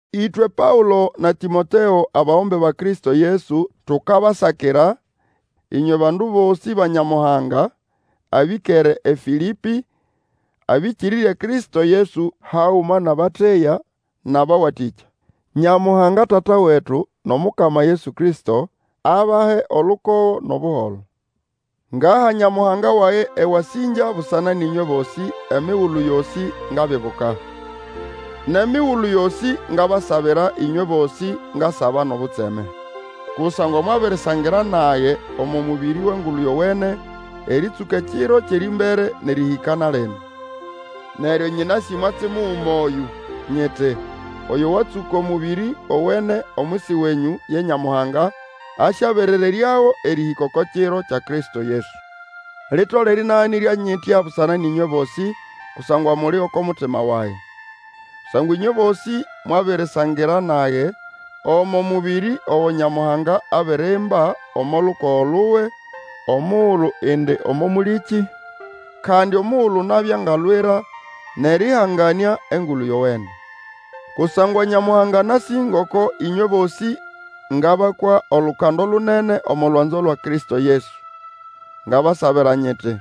Ĩtwe Paũlo na Tĩmoteo, abagombe ba Kristo Yesu, tukabasakira, ĩnywe bandu bosĩ ba Nyamuhanga abĩkere eFĩlĩpĩ, abĩkĩrĩrye Kristo Yesu, haguma nʼabateya nʼabawatĩkya. Nyamuhanga Tata wetu nʼOmukama Yesu Kristo, abahe olukogo nʼobuholo. Ngaha Nyamuhanga wage ewasĩngya busana nʼĩnywe bosĩ, emigulu yosĩ ngabibuka. Nʼemigulu yosĩ ngabasabira ĩnywe bosĩ, ngasaba nʼobutseme. Kusangwa mwabirisangira nage omo mũbĩrĩ wʼEngulu Yowene, erĩtsũka ekiro kyʼerĩmbere nʼerĩhĩka na lino. Neryo nyĩnasĩ mwatsi muguma oyũ, nyiti, oyo watsũka omũbĩrĩ owene omwisi wenyũ, ye Nyamuhanga, asyaberereryago erĩhĩka oko kiro kya Kristo Yesu. Litolere ĩnaganĩrya nyitya busana nʼĩnywe bosĩ, kusangwa muli oko mutima wage. Kusangwa ĩnywe bosĩ mwabirisangira nage omo mũbĩrĩ ogo Nyamuhanga abirimba omo lukogo luwe, omugulu indi omo mũlĩkĩ, kandi omugulu nabya ngalwira nʼerĩhanganĩa Engulu Yowene. Kusangwa Nyamuhanga anasĩ ngoko ĩnywe bosĩ ngabakwa olukando lunene omo lwanzo lwa Kristo Yesu. Ngabasabira nyiti,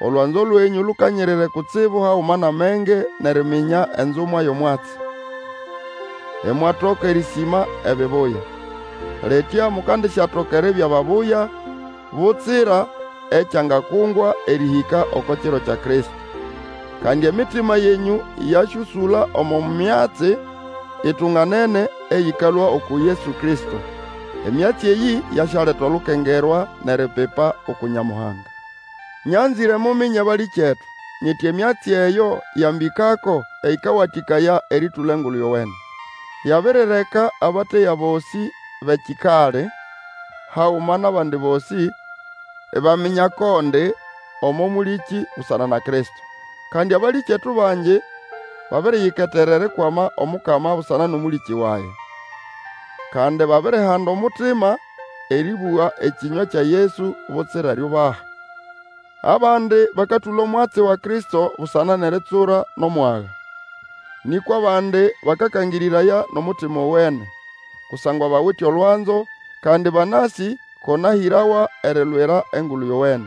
olwanzo lwenyũ lukanyirire kutsibu haguma nʼamenge nʼeriminya enzumwa yʼomwatsi. Imwatoka erĩsĩma ebibuya. Litya mukandisyatoka eribya babuya, butsira ekyangakungwa, erĩhĩka oko kiro kya Kristo. Kandi emitima yenyũ yasyũsũla omo myatsi itunganene eyĩkalũa uku Yesu Kristo. Emyatsi eyĩ yasyaleta olukengerwa nʼeripipa uku Nyamuhanga. Nyanzĩre muminye, balĩkyetu, nyiti emyatsi eyo yambĩkako ĩkawatĩkaya erĩtũla Engulu Yowene. Yabirireka abateya bosĩ bʼekikali, haguma nʼabandi bosĩ, ibaminya ko ndi omo mũlĩkĩ busana na Kristo. Kandi abalĩkyetu bangi babiriyiketera erikwama Omukama busana nʼomũlĩkĩ wage. Kandi babirihanda omutima erĩbũga ekĩnywa kya Yesu butsira eriubaha. Abandi bakatũla omwatsi wa Kristo busana nʼeritsura nʼomwaga. Nĩkwa abandi bakakangĩrĩraya nʼomutima owene, kusangwa bawite olwanzo, kandi banasĩ ko nahĩrawa erilwira Engulu Yowene.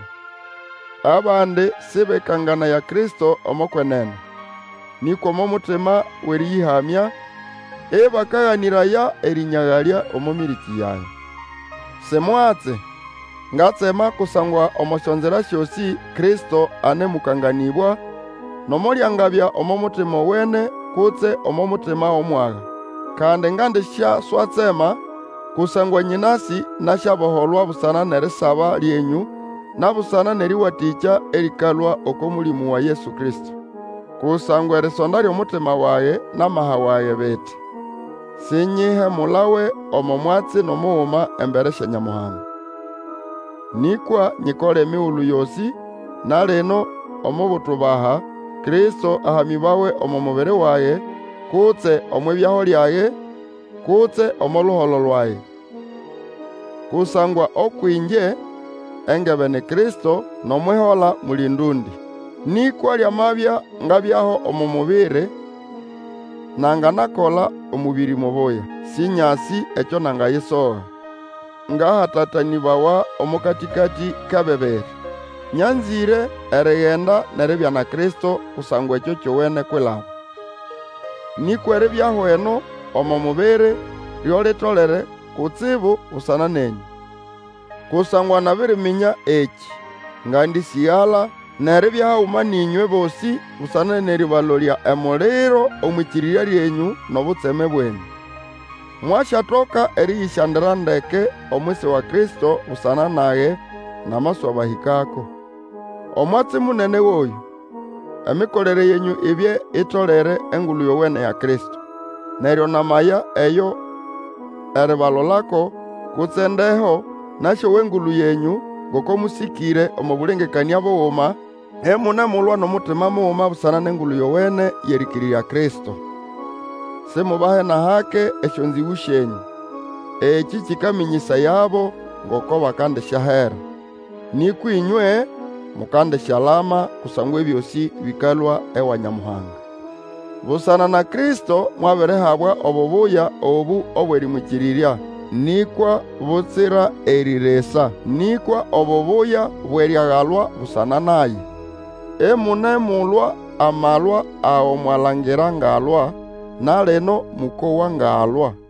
Abandi sĩbekanganaya Kristo omo kwenene, nĩkwa omo mutima wʼerĩyĩhamya, ĩbakaganĩraya erĩnyagalya omo mĩrĩkĩ yage. Si mwatsi! Ngatsema, kusangwa omo syonzira syosĩ Kristo anemũkanganĩbwa, nomo lyangabya omo mutima owene kutse omo mutima wʼomwaga. Kandi ngandisyaswatsema, kusangwa nyĩnasĩ nasyaboholwa busana nʼerisaba lyenyũ na busana nʼerĩwatĩkya erĩkalũa oko Mũlĩmũ wa Yesu Kristo. Kusangwa erisonda lyʼomutima wage, nʼamaha wage biti, sinyihemulawe omo mwatsi nʼomuguma embere sya Nyamuhanga. Nĩkwa nyikole emigulu yosĩ, na lino, omo butubaha, Kristo ahamĩbawe omo mubiri wage, kutse omwʼibyaho lyage, kutse omo luholo lwage. Kusangwa ũkwʼĩngye, engebe ni Kristo, nʼomwʼihola muli ndũndĩ! Nĩkwa lyamabya ngabyaho omo mubiri, nanganakola omũbĩrĩ mubuya. Sĩnyasĩ ekyo nangayisoga. Ngahatatanĩbawa omo katĩkatĩ kʼebibiri. Nyanzĩre erigenda nʼeribya na Kristo, kusangwa ekyo kyowene kwilaba. Nĩkwa eribyaho eno omo mubiri, lyo litolere kutsibu busana nenyũ. Kusangwa nabiriminya ekĩ, ngandĩsĩgala, nʼeribya haguma nʼĩnywe bosĩ busana nʼerĩbalolya emuliro omwʼĩkĩrĩrya lyenyũ, nʼobutseme bwenyũ. Mwasyatoka erĩyĩsyandira ndeke omwisi wa Kristo busana nage namaswabahĩkako. Omwatsi munene goyũ, emikolere yenyũ ibye itolere Engulu Yowene ya Kristo. Neryo, namaya eyo eribalolako, kutse ndeho, nasyowa engulu yenyũ, ngoko mũsĩkĩre omo bũlengekanĩa buguma, imunemulwa nʼomutima muguma busana nʼEngulu Yowene yʼerĩkĩrĩrya Kristo. Simubahe nʼahake esyonzĩgũ syenyũ, ekĩ kĩkamĩnyĩsayabo ngoko bakandisyahera. Nĩkwa ĩnywe mukandisyalama, kusangwa ebyosĩ bĩkalũa ewa Nyamuhanga. Busana na Kristo mwabirihabwa obubuya obũ obwʼerĩmwĩkĩrĩrya, nĩkwa butsira erĩ risa, nĩkwa obubuya bwʼeriagalwa busana naye. Imunemulwa amalwa ago mwalangira ngalwa, na lino mũkowa ngalwa.